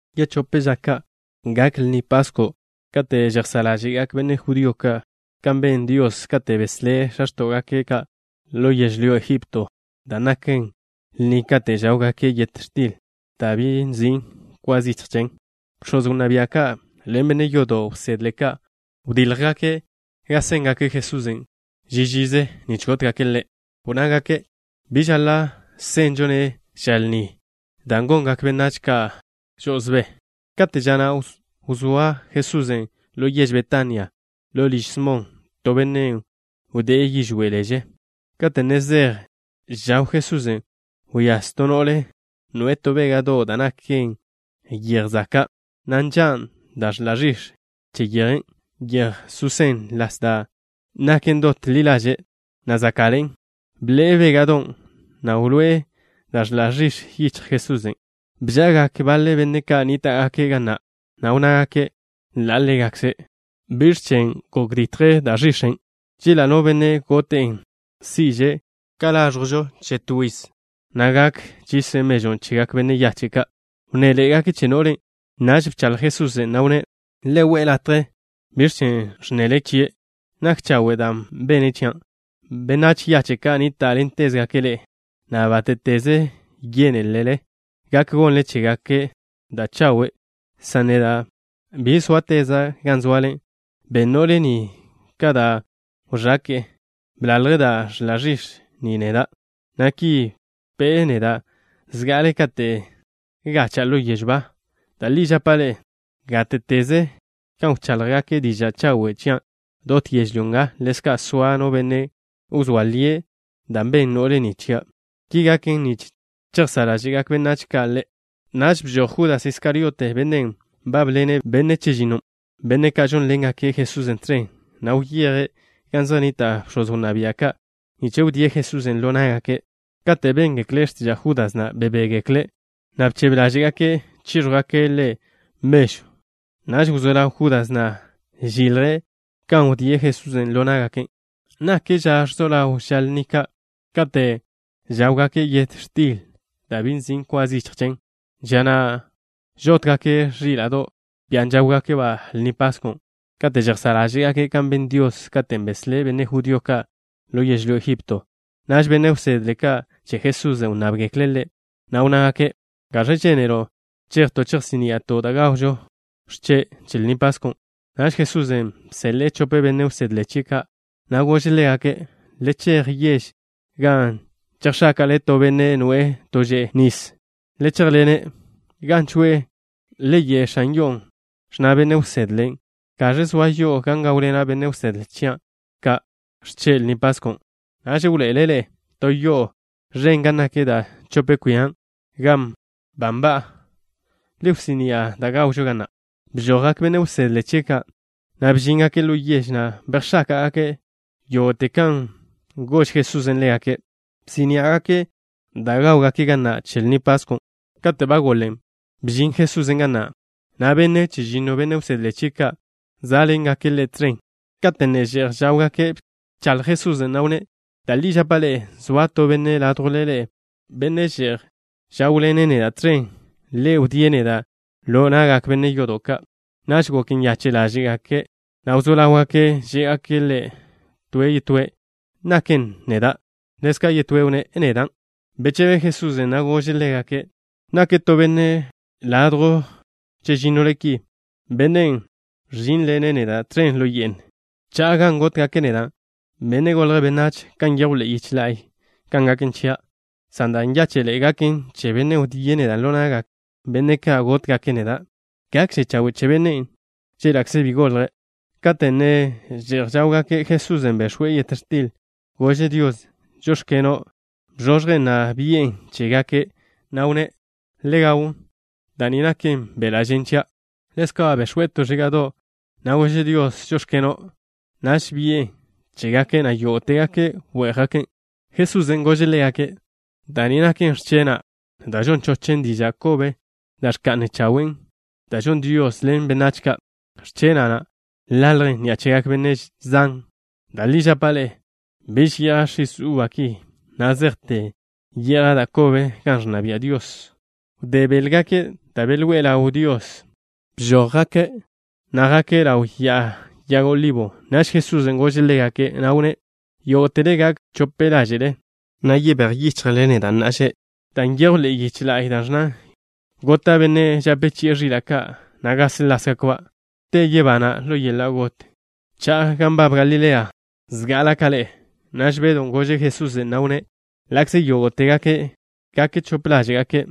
Yechóp ža ka', gak Lni Pasko' kate' žejsá' ḻáže'gak benne' judío ka' kan ben Dios kate' beslé' x̱a x̱tó'gake' ka' ḻo yežlyó Egipto, da' naken lni kate' žáwgake' yet x̱til da' bi nzin' kwa zichj chen. Bx̱oz wnná bia' ka' ḻen benne' yodo' wsedle ka', wdíljgake' kan séngake' Jesusen' ži žize nich gótgake' Ḻe'. Wnnágake': —Bi žaḻa' senžo-ne' ža lni dan' gongak benách ka' žo'osbé. Kate' ža na' wzóa Jesusen' ḻo yež Betania, ḻo liž Smon, to benne' wdé'e yižwé' leže. Kate' ne že'j žaw Jesusen', wyáz to no'le, noe'e to béga'do' da' naken yej zaka', na' nža' da' ẕḻa' ẕix̱ che yeje susén las da' naken dot ḻi ḻaže', na' záka'ḻe'en. Bḻe'e béga'don', na' wloé'e da' ẕḻa' ẕix̱ yichj Jesusen'. Bža'agak baḻe benne' ka' nníta'gake' ga na', na' wnnágake' ḻa' ḻégakze': —¿Biẕ chen' gok ditje da' ẕix̱en'? Chela' no benne' gote'en, si'že' ka láẕjwžo che to yiz, na' gak chise' mežwn' chegak benách yache' ka'. Wnnéḻe'egake' che no'len'. Naž bchaḻj Jesusen', na' wnné': —Le we'e latje. ¿Biẕ chen' ẕnnele chie'? Nak chawe' dan' bene' chia'. Benách yache' ka' nníta'ḻentezgake' ḻe'e, na' bátte'teze yénelele, gak gonle chégake' da' chawe', san neda' bi sóateza' gan zoale. Ben no'le ni ka da' wẕake'e. Bḻalje' da' ẕḻa' ẕix̱ ni neda', na' ki bpe'e neda' zga'ale kate' gacha'a ḻo yežw ba. Da' li žapa' ḻe'e, gáte'teze gan wcháḻjgake' diža' chawe' chian' dot yežlyó nga, ḻezka' soa no benne' wzóa lie' da' ben no'le ni chia'. Ki gaken nich chejsá' ḻáže'gak benách ka' ḻe'. Naž bžoj Judas Iskariote, bennen' nbábḻene' benne' chežinno, benne' ka' žónḻengake' Jesusen' tẕen, na' wyeje' gan zej nnita' bx̱oz wnná bia' ka' nich wdíe' Jesusen' ḻo ná'gake'. Kate' béngekle' x̱tiža' Júdas na', bebégekle', na' bchebe ḻáže'gake' chíẕjwgake' ḻe' mežw. Naž wzó ḻaw Judas na' žilje' kan wdíe' Jesusen' ḻo ná'gake'. Nak ža ẕzo ḻaw žak lni kate' žáwgake' yet x̱til da' bi nzin' kwa zichj chen, ža na' žótgake' ẕíla'do', bian' žáwgake' Lni Paskon', kate' žejsá' ḻáže'gake' kan ben Dios katen' beslé' benne' judío ka' ḻo yežlyó Egipto. Naž benne' wsedle ka' che Jesusen' wnnábgekle' Ḻe', na' wnnágake': —¿Gaẕ žénelo' chejto' chejsí'ni'ato' da' gawžo x̱che' che Lni Pasko'? Naž Jesusen' bseḻe'e chope benne' wsedle chie' ka', na' gože' ḻégake': —Le chej ḻo yež, gan chejx̱áka'le to benne' noe'e to že'e nis. Le chéjḻene'. Gan choe'e, le ye' x̱an yo'on': “Ẕnna Benne' wsedle: ¿Gaẕ zoa yo'o gan gáwḻena' benne' wsedle chia' ka' x̱che' che Lni Pasko'?” Naž wḻoe'ele' ḻe'e to yo'o ẕen gan nak da' chope kwia gan ba nba'a. Le wsí'ni'a da' gawžo ga na'. Bžojgak benne' wsedle chie' ka', na' bžíngake' ḻo yež, na' bejx̱áka'gake' yógo'te kan ba gož Jesusen' ḻégake'. Bsí'ni'agake' da' gáwgake' ga na' che Lni Paskon'. Kate' ba goḻen, bžin Jesusen' ga na', na' benne' chežinno, benne' wsedle chie' ka', zá'ḻengake' Ḻe' tẕen. Kate' ne že'j žáwgake', bchaḻj Jesusen', na' wnné': —Da' li žapa' ḻe'e, zoa to benne' ládjwle ḻe'e, benne' že'j žáwḻene' neda' tẕen. Ḻe' wdíe' neda' ḻo na'gak benne' yodo' ka'. Naž gok nyache' ḻáže'gake', na' wzó ḻáwgake' žé'gake' Ḻe' to toe': —¿Naken neda'? Ḻezka' yetóe' wnné': —¿Nedan'? Bechebe Jesusen', na' gože' ḻégake': —Nake' to benne' ladjw chežínnole ki, bennen' ẕžínḻene' neda' tẕen ḻo ye'n. Cha'a gan gótgake' neda', Benne' Golje' Benách, kan nyejw ḻe'e yiche la'y kan gaken chia', san da' nyáche'ḻe'e gaken che bennen' wdíe' neda' ḻo na'gak benne' ka' gótgake' neda'. Gakže chawe' che bennen' chéla'kze bi golje'. Kate' ne že'j žáwgake', Jesusen' bex̱we' yet x̱til. Gože' Dios: “Žóx̱keno'.” Bzožjen', na' bi'en chégake', na' wnné': —Le gawn. Da' ni naken beḻa' žen chia'. Ḻezka' bex̱we' to ẕíga'do', na' gože' Dios: “Žóx̱keno'.” Naž bi'en chégake', na' yógo'tegake' wé'jgaken'. Jesusen' gože' ḻégake': —Da' ni naken x̱chena' da' žon chochen diža' kobe da' ẕka'nen chawe', dan' žon Dios ḻen benách ka'. X̱chena' na' ḻaljen ni'a chegak benne' zan. Da' li žapa' ḻe'e, biž ye'ja' x̱is uba ki na' zejte ye'ja' da' kobe gan ẕnna bia' Dios. Wdé béḻgake' da' belwé ḻáwgake' Dios, bžójgake', na' jake' ḻaw Ya'a Yag Olibo. Naž Jesusen' gože' ḻégake', na' wnné': —Yógo'tele gak chope ḻáže'le, na' yebéj yichjle neda' na'a že', dan' nyejw ḻe'e yiche la'y da' ẕnnan: “Gota' benne' žape chi'e ẕila' ka', na' gásḻasgakba'.” Te yebana' ḻo yeḻa' got, cha'a gan nbab Galilea zga'ala' ka ḻe'e. Naž Bedw gože' Jesusen', na' wnné': —Ḻa'kze yógo'tegake' gak chope ḻáže'gake',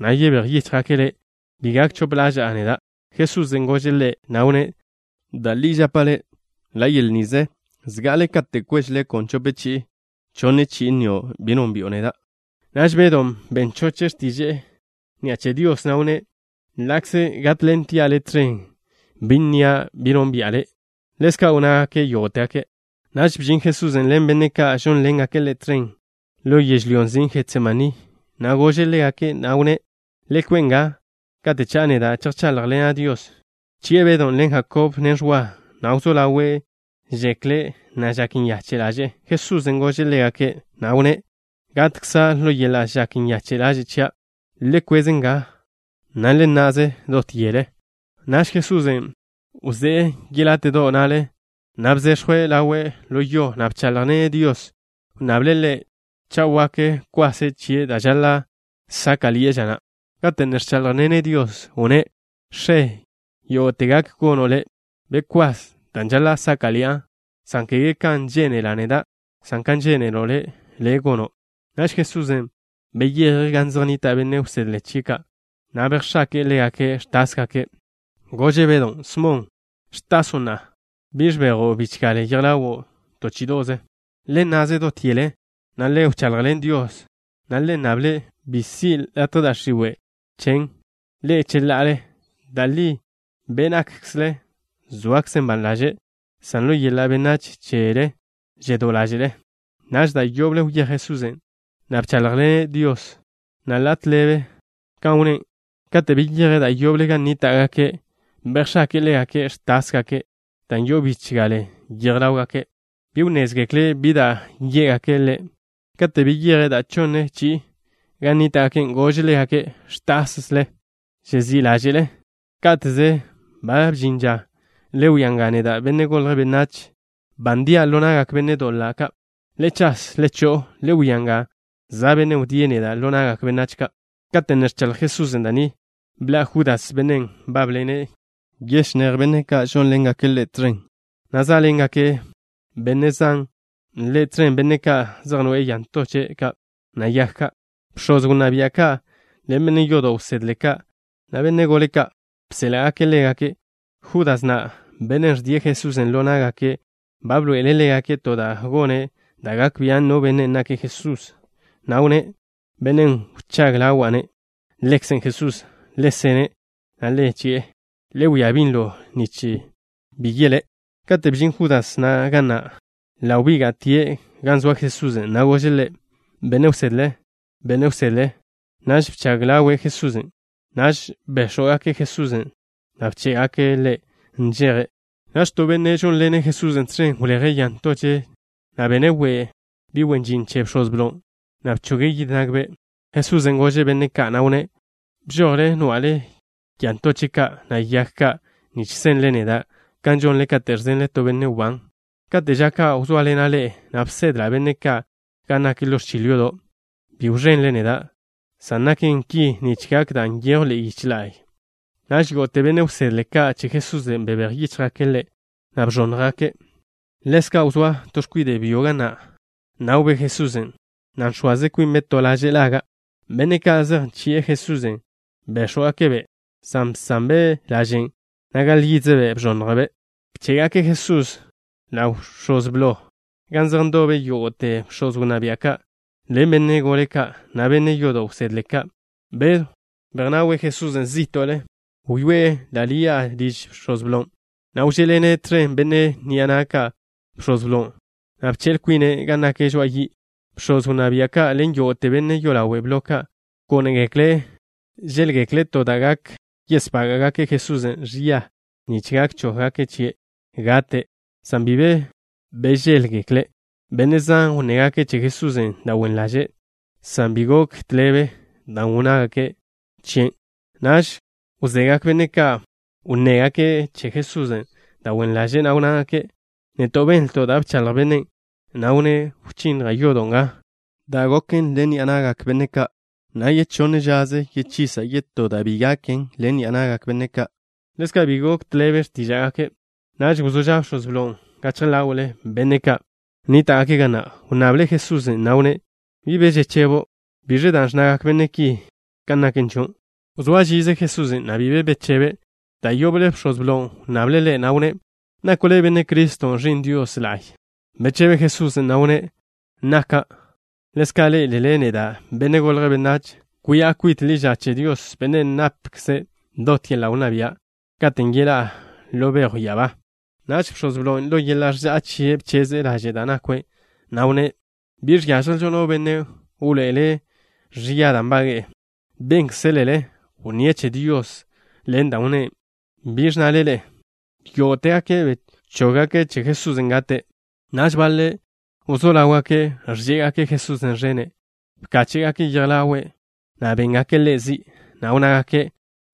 na' yebéj yíchjgake' Le', bi gak chope ḻaža'a neda'. Jesusen' gože' ḻe', na' wnné': —Da' li žapa' le', ḻa' yel nize, zga'ale kate' kweže leko' chope chi'i, chonne chi'i nnio' bi nónbi'o neda'. Naž Bedon' ben choche' x̱tiže'e ni'a che Dios, na' wnné': —Ḻa'kze gátḻentia' Le' tẕen, bi nnia' bi nónbi'a Le'. Ḻezka' wnnágake' yógo'tegake'. Naž bžin Jesusen' ḻen benne' ka' žónḻengake' Ḻe' tẕen ḻo yežlyón' nzin' Jetsemaní, na' gože' ḻégake', na' wnné': —Le kwe' nga, kate' cha'a neda', chejcháḻjḻena' Dios. Bchi'e Bedw ḻen Jakob, na' Ẕwa, na' wzó ḻawe' žekle', na' žak nyache' ḻaže'e. Jesusen' gože' ḻégake', na' wnné': —Gatkza' ḻo yeḻa' žak nyache' ḻaže' chia'. Le kwez nga, na' le nna'ze dot yele. Naž Jesusen' wzé'e yeláte'do' na'le, na' bzechw ḻawe' ḻo yo, na' bcháḻjḻene' Dios. Wnnable' Ḻe', cha' wak, kwase' chie' da' žaḻa' sáka'ḻi'e ža na'. Kate' ne ẕcháḻjḻene' Dios, wnné': —X̱e, yógo'te gak gono' Le'. Bekwás da' žaḻa' sáka'ḻi'a, san kege kan žénela' neda', san kan žénelo' Le', gono'. Naž Jesusen' beyeje' gan zej nnita' benne' wsedle chie' ka', na' bejx̱ake'e ḻégake' ẕtásgake'. Gože' Bedon': —Smon, ¿ẕtaso' na'a? ¿Bi ẕbejo' bichgale yej ḻawo' to chí'ido'ze? Le nna'ze dot yele, na' le wchaḻjḻen Dios, na' le nnable' bi si' latje da' x̱iwe' chen' ḻe'e cheḻa'ale. Da' li be' nákkzele zoakzen ban ḻaže', san ḻo yeḻa' benách chele žedó ḻáže'le. Naž da' yoble wyéj Jesusen', na' bcháḻjḻene' Dios, na' ḻa' tḻebe kan wnné'. Kate' beyeje' da' yoble gan nníta'gake', bejx̱ake'e ḻégake' ẕtásgake' dan' yo'o bichgale yej ḻáwgake'. Bi wnnézgekle' bi da' yé'gake' Ḻe'. Kate' beyeje' da' chonne chi'i gan nníta'gake', gože' ḻégake': —¿Ẕtasle? ¿Žezí' ḻáže'le? ¡Ká'teze! ¡Ba bžin ža! Le wia nga, neda', Benne' Golje' Benách, ba ndia' ḻo na'gak benne' doḻa' ka'. ¡Le chas! ¡Le cho'o! Le wia nga, za' bennen' wdíe' neda' ḻo na'gak benách ka'. Kate' ne ẕchaḻj Jesusen' da' ni, bḻa' Judas, bennen' nbábḻene' yechinéj benne' ka' žónḻengake' Ḻe' tẕen, na' zá'ḻengak benne' zan ḻe' tẕen, benne' ka' zej noe'e ya ntoche' ka', na' yag ka'. Bx̱oz wnná bia' ka' ḻen benne' yodo' wsedle ka', na' benne' gole ka', bséḻa'gake' ḻégake'. Judas na', bennen' ẕdie' Jesusen' ḻo ná'gake' ba bḻoe'ele' ḻégake' to da' gone' da' gak bian' no benne' nake' Jesusen', na' wnné': —Bennen' wchág ḻawa'-ne', Ḻekze' Jesusen'. Le sene', na' le chi'e. Le wia binlo nich bi yelé'. Kate' bžin Judas na' ga na', ḻa' wbíga'tie' gan zoa Jesusen', na' gože' Ḻe': —Benne' wsedle, Benne' wsedle. Naž bchag ḻawe' Jesusen'. Naž béx̱wgake' Jesusen', na' bché'gake' Ḻe' nžeje'. Naž to benne' žónḻene' Jesusen' tẕen wleje' ya ntoche', na' bene' we' bi' wen žin che bx̱oz blo, na' bchoge' yid nagbe'. Jesusen' gože' benne' ka', na' wnné': —¿Bžojle nwa'le ya ntoche' ka', na' yag ka' nich senle neda', kan žonle kate' ẕzenle to benne' wbán? Kate' ža ka' wzóaḻena' ḻe'e, na' bsedla' benne' ka' gan nak ḻo ẕchil yodo', bi wẕenle neda', san žaken ki nich gak da' nyejw ḻe'e yiche la'y. Naž yógo'te benne' wsedle ka' che Jesusen' bebéj yíchjgake' Ḻe', na' bẕónnjgake'. Ḻezka' wzóa to x̱kwide' byo ga na', nawbe' Jesusen', na' nx̱oaze kwinbe' to laže' laga'. Benne' ka' zej nchi'e Jesusen' béx̱wgake'-be', san bsanbe' lažen', na' gaḻ yídzebe' bẕonnjbe'. Bché'gake' Jesusen' ḻaw bx̱oz blo, gan zej ndobe yógo'te bx̱oz wnná bia' ka' ḻen benne' gole ka', na' benne' yodo' wsedle ka'. Bedw bejnawe' Jesusen' zí'to'le. Wyoé'e ḻa' ḻi'a liž bx̱oz blon', na' wžé'ḻene' tẕen benne' ni'a na' ka' bx̱oz blon', na' bche'l kwine' gan nak žoa'a yi'. Bx̱oz wnná bia' ka' ḻen yógo'te benne' yolawe' blo ka' gónegekle' žéḻgekle' to da' gak yesbága'gake' Jesusen' ẕia nich gak chóggake' chie' gate', san bi be bžéḻgekle'. Benne' zan wnnégake' che Jesusen' da' wen ḻaže', san bi gok tḻebe dan' wnnégake' chie'. Naž wzegak benne' ka' wnnégake' che Jesusen' da' wen ḻaze', na' wnnágake': —Neto' benlto' da' bchaḻj bennen', na' wnné': “Wchinnja' yodo' nga, da' benen ḻen ni'a na'gak benne' ka', na' yechonne žaze yechisa' yetó da' bi gonen ḻen ni'a na'gak benne' ka'.” Ḻezka' bi gok tḻebe x̱tíža'gake'. Naž wzó ža' bx̱oz blon' gachje ḻáwe'le benne' ka' nníta'gake' ga na'. Wnnable' Jesusen', na' wnné': —¿Bi be žechebo'? ¿Biẕen' da' ẕnnagak benne' ki kan naken chio'? Wzóa žize Jesusen', na' bi be bechebe'. Da' yoble bx̱oz blon' wnnable' Ḻe', na' wnné': —¿Nako' Le' Benne' Criston', Ẕi'n Dios la'y? Bechebe Jesusen', na' wnné': —Naka'. Ḻezka' ḻé'elele neda', Benne' Golje' Benách, soa' kwi'a kwit ḻi ža che Dios, Bennen' napkze' dot yeḻa' wnná bia', katen' yeḻá'a ḻo bejw ya'abá. Naž bx̱oz blon', ḻo yeḻa' ẕža'a chie' bcheze' laže' da' nakwe', na' wnné': —Bi žiážjelžo no benne' wḻoe'ele' ẕia da' nbage'e. Bénkzelele wnníe' che Dios ḻen da' wnné'. ¿Biẕ ẕnnale ḻe'e? Yógo'tegake' bchóggake' che Jesusen' gate'. Naž baḻe' wzó ḻáwgake' ẕžé'egake' Jesusen' ẕene'. Bkáche'gake' yej ḻawe', na' béngake' Ḻe' zi', na' wnnágake':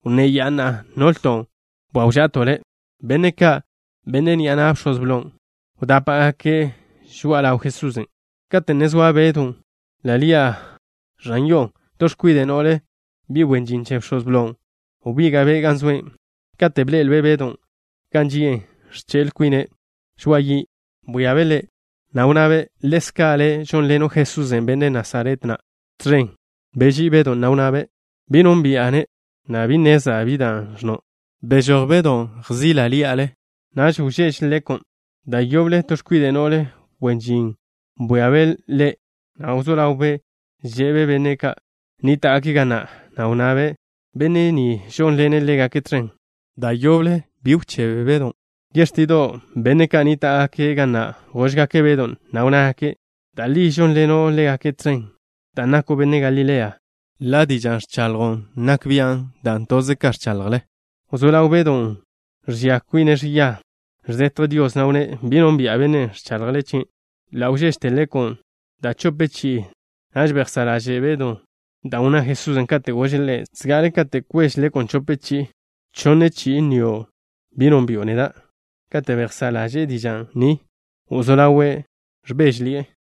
—Wnné ya'a na'a nolto' bwáwža'ato' Le'. Benne' ka', benne' ni'a na' bx̱oz blon', wdápa'gake' žoa'a ḻaw Jesusen'. Kate' ne zoa Bedw ḻi'a ẕan yo'o, to x̱kwide' no'le, bi' wen žin che bx̱oz blon', wbíga'be' gan zoe'. Kate' bḻe'elbe' Bedon' gan ži'e ẕche'l kwine' žoa'a yi', bwíabe' ḻe', na' wnnabe': —Ḻezka' le' žónḻeno' Jesús, benne' Nasaret na', tẕen. Beží'i Bedon', na' wnné': —Bi nónbi'a-ne', na' bi nnezla' bi dan' ẕnno'. Bežój Bedon', na' bejsóe' gan žázgake' ḻi'a na'. Naž wžeže leko'. Da' yoble to x̱kwide' no'le wen žin bwíabe' ḻe', na' wzó ḻawbe' že'be' benne' ka' nníta'gake' ga na', na' wnnabe': —Benne' ni žónḻene' ḻégake' tẕen. Da' yoble bžon Bedon'. Yextido', benne' ka' nníta'gake' ga na' góžgake' Bedon', na' wnnágake': —Da' li žónḻeno' ḻégake' tẕen, dan' nako' benne' Galilea. Ḻa' díža'ze ẕchaḻjo' zej nak bi'o, dan' toze kan ẕchaḻjle. Wzó ḻaw Bedon' žẕia kwine' ẕia, ẕzetje' Dios, na' wnné': —Bi nónbi'a bennen' ẕchaḻjle chie'. Ḻa' wžéžete leko' da' chope chi'i. Naž bejsá' ḻaže' Bedon' dan' wnná Jesusen', katen' gože' ḻe': “Zga'ale kate' kweže leko' chope chi'i, chonne chi'i nnio' bi nónbi'o neda'.” Kate' bejsá' ḻaže'e diža' ni, wzó ḻawe' ẕbéžeḻi'e.